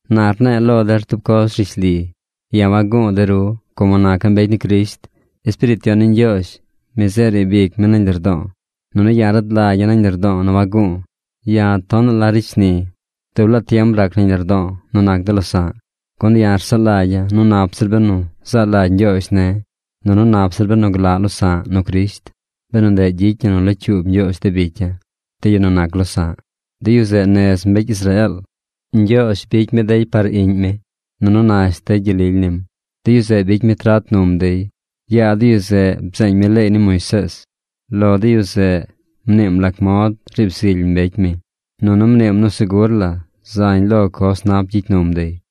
Na rne̱e̱ lo der tub coz rishli: ya̱ wagu̱u̱ de ru, como naca̱ mbecy ni Crisht. Espiriit Yon ni Ñgyoozh, mi zeꞌ riib ic mi nañ lardo̱o̱, nunu ya̱ rad lagya̱ nañ lardo̱o̱ nu wagu̱u̱. Ya̱ tonaꞌ la ricy shni. Dub laa tiem rac nañ lardo̱o̱ nu nac de losa̱ꞌ. Gun ya̱ rsaꞌ lagya̱ nu nap zir benu zaa lagy Ñgyoozh ne̱, nunu nap zir benu glaꞌ losa̱ꞌ nu Crisht, benu ndeꞌ gyicy ñi nu locyuub Ñgyoozh de bicya̱, de yu nu nac losa̱ꞌ. De yu zeꞌ nez mbecy Israeel. Ñgyoozh bicy mi dey par iꞌñ mi. Nunu nash dey gyel lily nim. De yu zeꞌ bicy mi trat num dey. Yaa de yu zeꞌ, bzeeñ mi leey ni Moisees. Lo de yu zeꞌ, mniim lac mod riib zily mbecy mi. Nunu mniim nu segur la zañ lo coz nap gyicy num dey.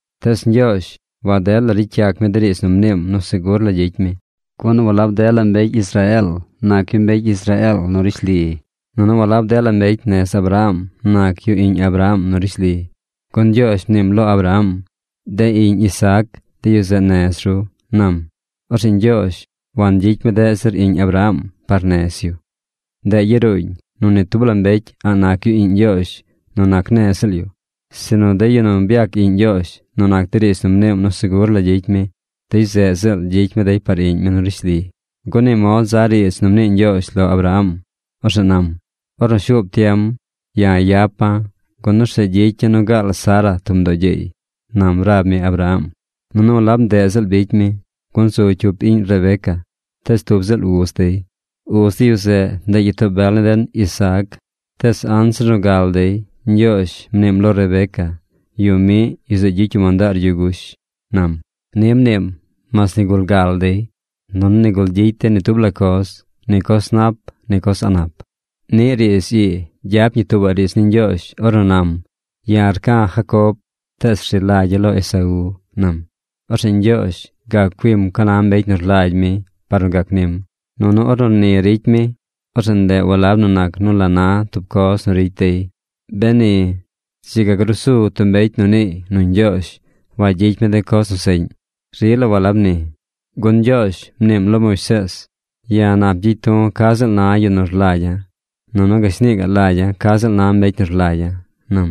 Tees Ñgyoozh waded la ricy yac mi de riidz nu mniim nu segur la gyicy mi. Gun walab dela mbecy Israeel nac yu mbecy Israeel nu rishli. Nunu walab dela mbecy nez Abraham nac yu iꞌñ Abraham nu rishli, gun Ñgyoozh mniim lo Abraham: “De iꞌñ Isaac, de yu zeꞌ nez ru”, nam. Orzeꞌ Ñgyoozh wangyicy mi deꞌ zir iꞌñ Abraham par nez yu. Ndeꞌ yaruuñ nu ni tub la mbecy a̱ꞌ nac yu iꞌñ Ñgyoozh nu nac nez ziꞌl yu, sinu de yu nu byac iꞌñ Ñgyoozh nu nac de riidz nu mniim nu segur la gyicy mi, dey yu zeꞌ ziꞌl gyicy mi dey par iꞌñ mi nu rishli. Gun ni mod za riidz nu mnii Ñgyoozh lo Abraham. Orzeꞌ nam: “Ornu shuub tiem, ya̱ yapa̱, gun orzeꞌ gyicya̱ nu gaal Sara tub mdoo gyeey”, nam rab mi Abraham. Nunu walab ndeꞌ ziꞌl bicy mi, gun zu cyup iꞌñ Rebeca tees tub ziꞌl uz dey. Uz de yu zeꞌ, ndeꞌ gyitoo bel ni den Isaac. Tees anzir nu gal dey, Ñgyoozh mniim lo Rebeca: “Yu miꞌ, yu zeꞌ gyicy yu mandaar yu gush”, nam. Ni mniim mas nigul gal dey, nunu nigul gyicy dey ni tub la coz: ni coz nap, ni coz a̱ꞌ nap. Niꞌ riidz ii gyap ñi tuubaꞌ riidz ni Ñgyoozh, ornu nam: “Ya̱ rca̱ Jacob, tees rzi lagya̱ lo Esaú”, nam. Orzeꞌ Ñgyoozh gac cuim ca na mbecy nu rlagy mi par nu gac nim. Nunu ornu ni ricy mi, orzeꞌ ndeꞌ walab nu nac nu la na tub coz nu ricy dey. Beni, dzi ga gruu su tub mbecy nu niiy nu Ñgyoozh wagyicy mi de coz nu seꞌñ. ¡Rila walab ni! Gun Ñgyoozh mniim lo Moisees: “Ya̱ nap gyicy du̱ ca ziꞌl na yu nu rlagya̱, nunu gashni gaꞌ lagya̱ ca ziꞌl na mbecy nu rlagya̱”, nam.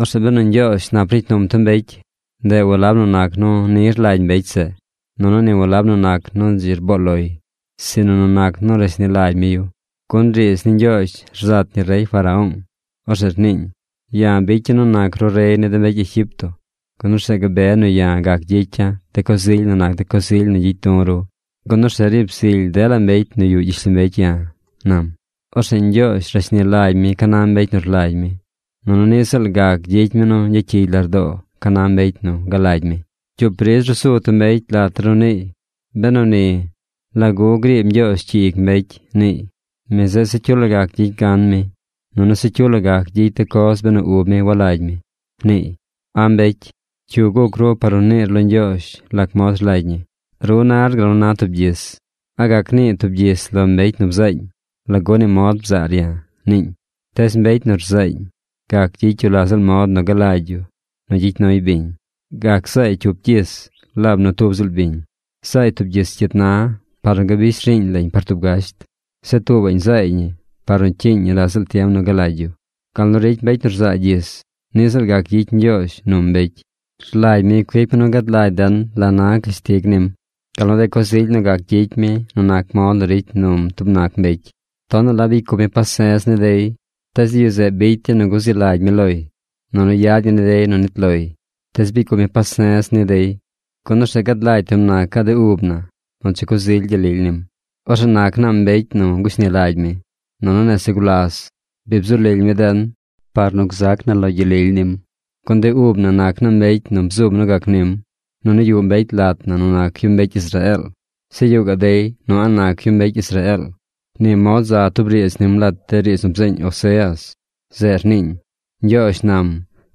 Orzeꞌ benu Ñgyoozh nap ricy num tub mbecy, ndeꞌ walab nu nac nu ni rlagy mbecy zeꞌ, nunu ni walab nu nac nu dzi rboo loy, sinu nu nac nu rashni lagy mi yu. Gun riidz ni Ñgyoozh rzat ñi rey Faraón. Orzeꞌ rniiñ: “Ya̱ bicya̱ nu nac ru rey ni de mbecy Egipto, gun orzeꞌ gabe nu ya̱ gac gyicya̱ de coz ily nu nac de coz ily nu gyicy du̱ ru, gun orzeꞌ riib zily dela mbecy nu yuꞌ gyishlombecy ya̱”, nam. Orzeꞌ Ñgyoozh rashni lagy mi ca na mbecy nu rlagy mi. Nunu niꞌ ziꞌl gac gyicy mi nu gyacyigy lardoo ca na mbecy nu galagy mi. Cyup ridz ruu su tub mbecy lat der nu niiy: “Benu ni, ¿lagu griib Ñgyoozh cyi ic mbecy?” niiy. “Mi zeꞌ se cyu la gac gyicy gan mi, nunu se cyu la gac gyicy de coz benu ub mi walagy mi”, niiy. ¡A̱ mbecy! ¿Cyu guc ru par nu niir lo Ñgyoozh lac mod rlagy ñi? Ru nar gal nu na tub gyis. ¿A gac nii tub gyis lo mbecy nu bzaañ: “¿Lagu ni mod bzaar ya̱?” niiñ? Tees mbecy nu rzaañ gac gyicy yu lac ziꞌl mod nu galagy yu nu gyicy nuy biñ. Gac zaay cyup gyis laab nu tub ziꞌl biñ. Zaay tub gyis cyit na par nu gabish riiñ lañ par tub gasht. Zeꞌ tuubaꞌñ zaay ñi par nu cyiiñ ñi la ziꞌl tiem nu galagy yu. Gal nu ricy mbecy nu rzaa gyis, niꞌ ziꞌl gac gyicy Ñgyoozh num mbecy. Rlagy mi cuic mi nu gad lagy den la na cashtig nim, gal nu de coz ily nu gac gyicy mi nu nac mod nu ricy num tub nac mbecy. Tonaꞌ la bicy cup mi pase̱z ni dey, tees de yu zeꞌ bicy dey nu guzi lagy mi loy, nunu yad ñi ni dey nu nit loy. Tees bicy cup mi pase̱z ni dey, gun orzeꞌ gad lagy tub nacaꞌ de ub na nu dzi coz ily gyel lily nim. Orzeꞌ nac naa mbecy nu gushni lagy mi. Nunu nese gulas bi bzu lily mi den par nu gzac na lo gyel lily nim. Gun de ub na nac naa mbecy nu bzum nu gac nim. Nunu yuꞌ mbecy lat na nu nac yu mbecy Israeel. Zeꞌ yuꞌ gaꞌ dey nu a̱ꞌ nac yu mbecy Israeel. Ni mod za tub riidz nim lat de riidz nu bzeeñ Oseas. Zeꞌ rniiñ: Ñgyoozh nam: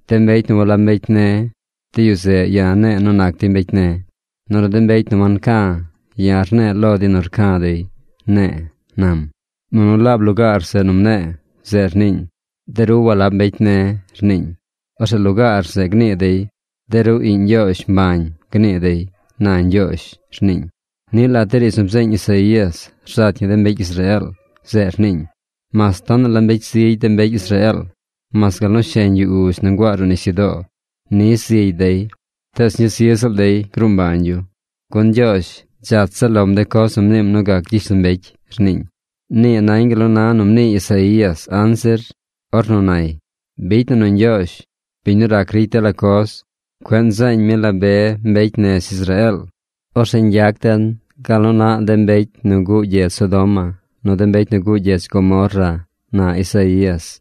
“De mbecy nu walab mbecy ne̱, de yu zeꞌ ya̱ ne̱e̱ nu nac dey mbecy ne̱. Nunu de mbecy nu wanca̱, ya̱ ne̱e̱ lo dey nu ya̱ rca̱ dey, ne̱e̱”, nam. Nunu laab lugaar zeꞌ nu mne̱e̱, zeꞌ rniiñ: “De ru walab mbecy ne̱”, rniiñ, orzeꞌ lugaar zeꞌ gnii dey: “De ru iꞌñ Ñgyoozh mbañ”, gnii dey, na Ñgyoozh, rniiñ. Niꞌ lat de riidz nu bzeeñ Isaías rzat ñi de mbecy Israeel. Zeꞌ rniiñ: “Mas tonaꞌ la mbecy zigy de mbecy Israeel, mas gal nu sheñ yu uzh nu nguaa ruꞌ nisyudoo ni zigy dey, tees ñuu zi ziꞌl dey gruu mbañ yu. Gun Ñgyoozh dzach zaꞌ lom de coz nu mniim nu gac gyishlombecy”, rniiñ. Nii nañ gal nu na nu mnii Isaías anzir, ornu nay: Bicy na nu Ñgyoozh, biñ nu rac ricy dela coz, cueꞌ nzeeñ mi la be mbecy nez Israeel, orzeꞌ ñgyac den gal nu naꞌ de mbecy nu guꞌ gyedz Sodoma, nu de mbecy nu guꞌ gyedz Gomorra, na Isaías.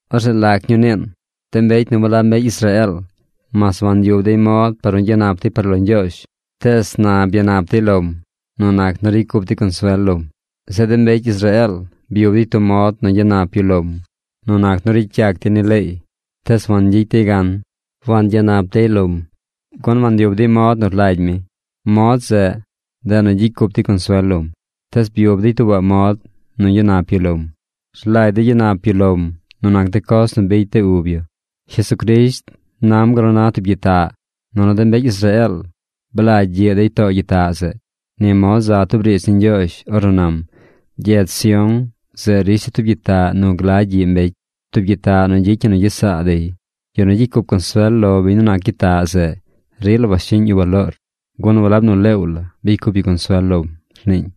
Orzeꞌ ¿lac ñuu niin? De mbecy nu walab mbecy Israeel, mas wanyub dey mod par nu gyanap dey par lo Ñgyoozh, tees na byanap dey lom nu nac nu ricy cup dey consuel lom. Zeꞌ de mbecy Israeel byub dey tub mod nu gyanap yu lom nu nac nu ricy yac dey ni leey, tees wangyicy dey gan. Wangyanap dey lom, gun wanyub dey mod nu rlagy mi. Mod zeꞌ, ndeꞌ nu gyicy cup dey consuel lom. Tees byub dey tuubaꞌ mod nu gyanap yu lom. Rlagy dey gyanap yu lom nu nac de coz nu bicy de ub yu. Jesucrisht nam gal na tub gyitaꞌ, nunu de mbecy Israeel blagy gyiꞌ dey too gyitaꞌ zeꞌ. Ni mod za tub riidz ni Ñgyoozh ornu nam: Gyedz Sión zeꞌ risha̱ tub gyitaꞌ nu glagy gyiꞌ mbecy, tub gyitaꞌ nu gyicy ñi nu gyesaa dey. Yu nu gyicy cup consuel lo biñ nu nac gyitaꞌ zeꞌ, rila washiꞌñ yu baloor, gun walab nu leew bicy cup yu consuel lom, rniiñ.